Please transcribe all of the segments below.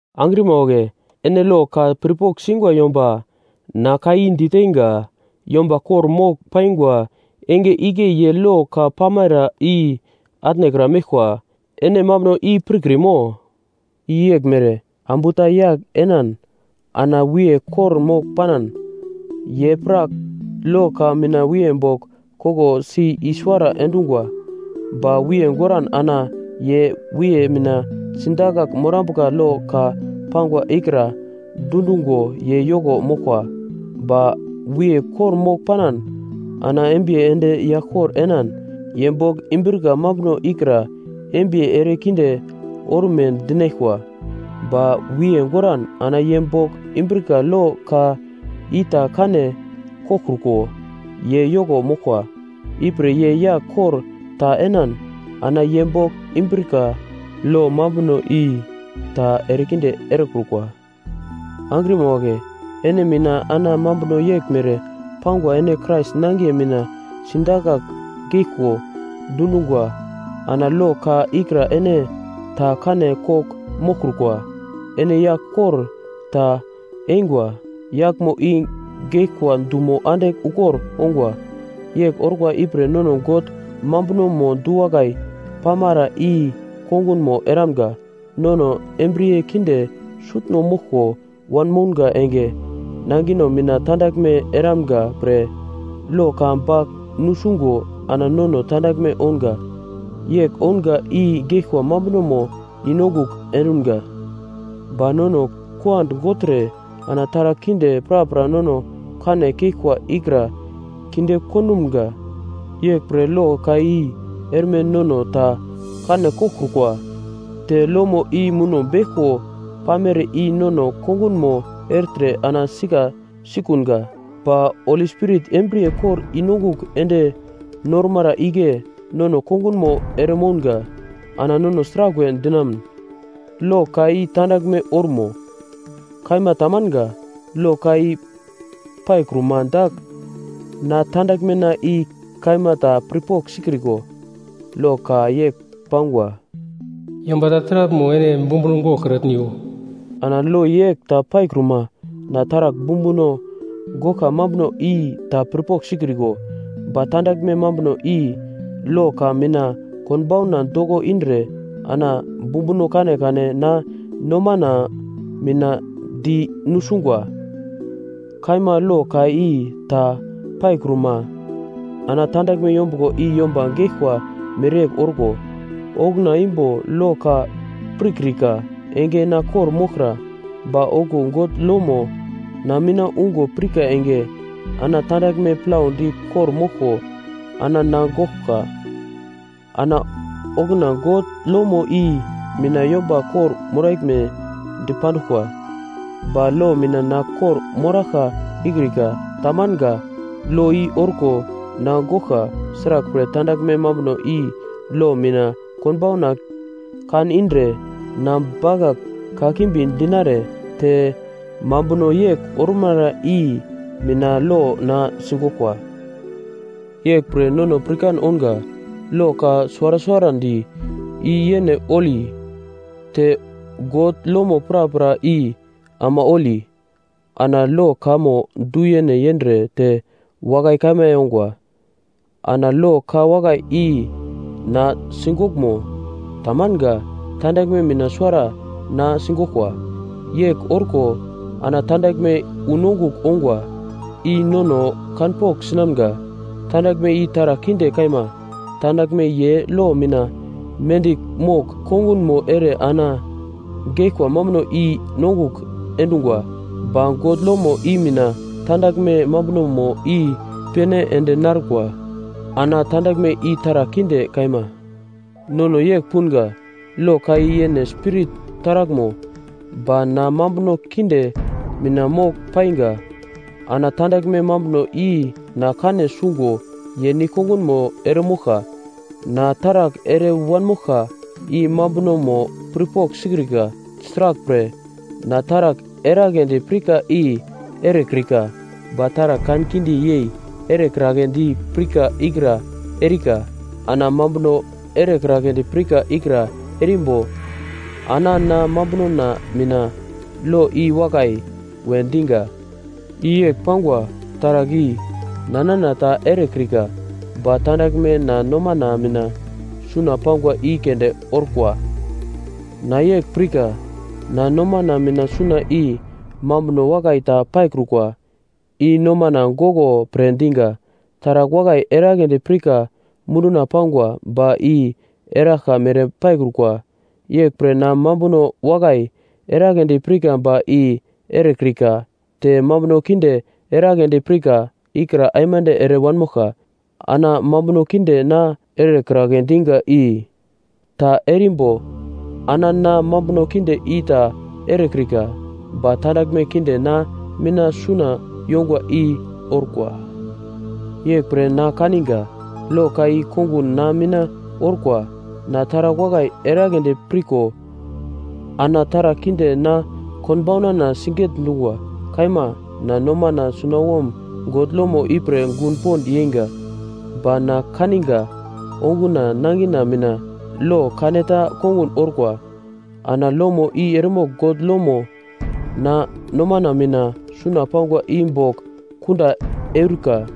Angrima wagle, ene lo ka pirpogl singwa yomba na ka i diteinga. Yomba kor-mogl paingwa enge igle ye lo ka pamara i atnekra meglkwa. Ene mambuno i pirkrimo? I yeglmere: ambu ta yagl enan ana wiye kor-mogl panan, ye pra lo ka mina wiye bogl koglosi i-suwara endungwa. Ba wiye goran ana ye wiye mina sidakagl morambuka lo ka pangwa ikra dundungo ye yoko moglkwa. Ba wiye kor-mogl panan ana embiye ende yagl kor enan, ye bogl imbrika mambuno ikra embiye erekinde orme dinaglkwa. Ba wiye goran ana ye bogl imbrika lo ka ita kane koglkruko ye yoko moglkwa. Ipre ye yagl kor ta enan ana ye bogl imbrika lo mambuno i ta erekinde erekrukwa. Angrima wagle, ene mina ana mambuno yeglmere pangwa ene Krais nangiye mina sidakagl geglko dundungwa ana lo ka ikra ene ta kane kogl moglkrukwa. Ene yagl kor ta eingwa, yaglmo i geglkwa dumo andigl ukor ongwa, yegl orkwa ipre nono God mambunomo du-wakai pamara i kongunmo eramga. Nono embriye kinde sutno moglko wanmounga enge, nangino mina tandaglme eramga pre lo ka bagl nusungo ana nono tandaglme ounga. Yegl ounga i geglkwa mambunomo i-nongugl endumga. Ba nono kuand gogltre ana taragl kinde prapra nono kane keglkwa ikra kinde kondumga. Yeglpre lo ka i erme nono ta kane koglkrukwa, te lomo i muno beglko pamere i nono kongunmo ertre ana sika sikunga. Ba Holi Spirit embriye kor i-nongugl ende normara igle nono kongunmo eremounga. Ana nono sraglwe dinamun? Lo ka i tandaglme ormo? Kaima tamanga! Lo ka i paikruma dagl na tandaglmena i kaima ta pirpogl sikriko, lo ka yegl pangwa: “Yomba ta taraglmo ene bumbuno goglkratniwo.” Ana lo yegl ta paikruma, na taragl bumbuno goglkwa mambuno i ta pirpogl sikriko, ba tandaglme mambuno i lo ka mina konbauna doko indre ana bumbuno kanekane na nomana mina di nusungwa. Kaima lo ka i ta paikruma, ana tandaglme yombuglo i yomba geglkwa mereyegl orko, okuna imbo lo ka pirkrika enge na kor-moglkra. Ba okuwo God lomo na mina ungo pirka enge ana tandaglme plaudi kor-moglko ana na goglka. Ana okuna God lomo i mina yomba kor-moraglme dipanduglkwa, ba lo mina na kor-moraglka ikrika, tamanga, lo i orko na goglka. Sraglpre, tandaglme mambuno i lo mina konbauna kan indre na bakagl kakimbi dinare, te mambuno yegl ormara i mina lo na sigoglkwa. Yeglpre nono pirkan ounga: lo ka suwara suwarandi i yene holi, te God lomo prapra i ama holi, ana lo kamo du-yene yendre te wakai kaima yongwa. Ana lo ka wakai i na sigoglmo? Tamanga. Tandaglme mina suwara na sigoglkwa. Yegl orko ana tandaglme unongugl ongwa, i nono kanpogl sinamga, tandaglme i taragl kinde kaima. Tandaglme ye lo mina mendigl mogl kongunmo ere ana geglkwa mambuno i-nongugl endungwa. Ba God lomo i mina tandaglme mambunomo i-pene ende narkwa ana tandaglme i taragl kinde kaima. Nono yegl punga: Lo ka i yene Spirit taraglmo. Ba na mambuno kinde mina mogl painga. Ana tandaglme mambuno i na kane sungo ye nigl-kongunmo eremoglka. Na taragl ere wanmoglka i mambunomo pirpogl sikrika. Sraglpre, na taragl eragledi pirka i erekrika, ba taragl kankinde yei erekragledi pirka ikra erika. Ana mambuno erekragledi pirka ikra erimbo, ana na mambunona mina, “Lo i wakai” we diga. I yegl pangwa; taragl i na nana ta erekrika, ba tandaglme na nomana mina suna pangwa i keunde orkwa. Na yegl pirka: Na nomana mina suna i mambuno wakai ta paikrukwa, i nomana goglo pre diga. Taragl wakai eragledi pirka munduna pangwa, ba i eraglka mere paikrukwa. Yeglpre na mambuno wakai eragledi pirka ba i erekrika; te mambuno kinde erekragledi pirka ikra aimande ere wanmoglka. Ana mambuno kinde na erekragle diga i ta erimbo ana na mambuno kinde i ta erekrika, ba tandaglme kinde na mina suna yongwa i orkwa. Yeglpre na kaniga, lo ka i kongun na mina orkwa: Na taragl wakai eragledi pirko, ana taragl kinde na konbaunana siget-dungwa. Kaima, na nomana sunawom God lomo ipre gun pond yeinga. Ba na kaninga onguna nangina mina lo kaneta kongun orkwa. Ana lomo i eremogl God lomo na nomana mina suna pangwa i bogl kunda eurika.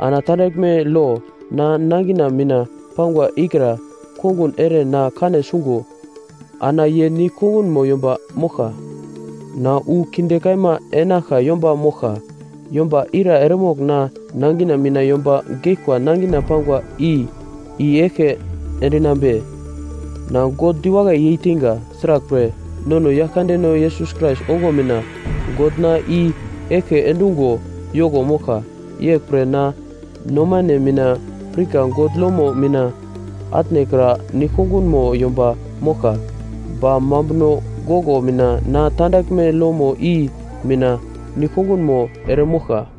Ana tandaglme lo na nangina mina pangwa ikra kongun ere na kane sungo ana ye nigl kongunmo yomba moglka. Na wu kinde kaima enaglka yomba moglka! Yomba ira eremogl na nangina mina yomba geglkwa nangina pangwa i i-eglke endinambe? Na God diwakai yeiteinga! Sraglpre, nono Yaglkandeno Yesus Krais ongo mina, God na i-eglke endungo yoko moglka. Yeglpre na nomane mina pirka God lomo mina atnekra nigl-kongunmo yomba moglka. Ba mambuno goglo mina na tandaglme lomo i mina nigl-kongunmo eremoglka.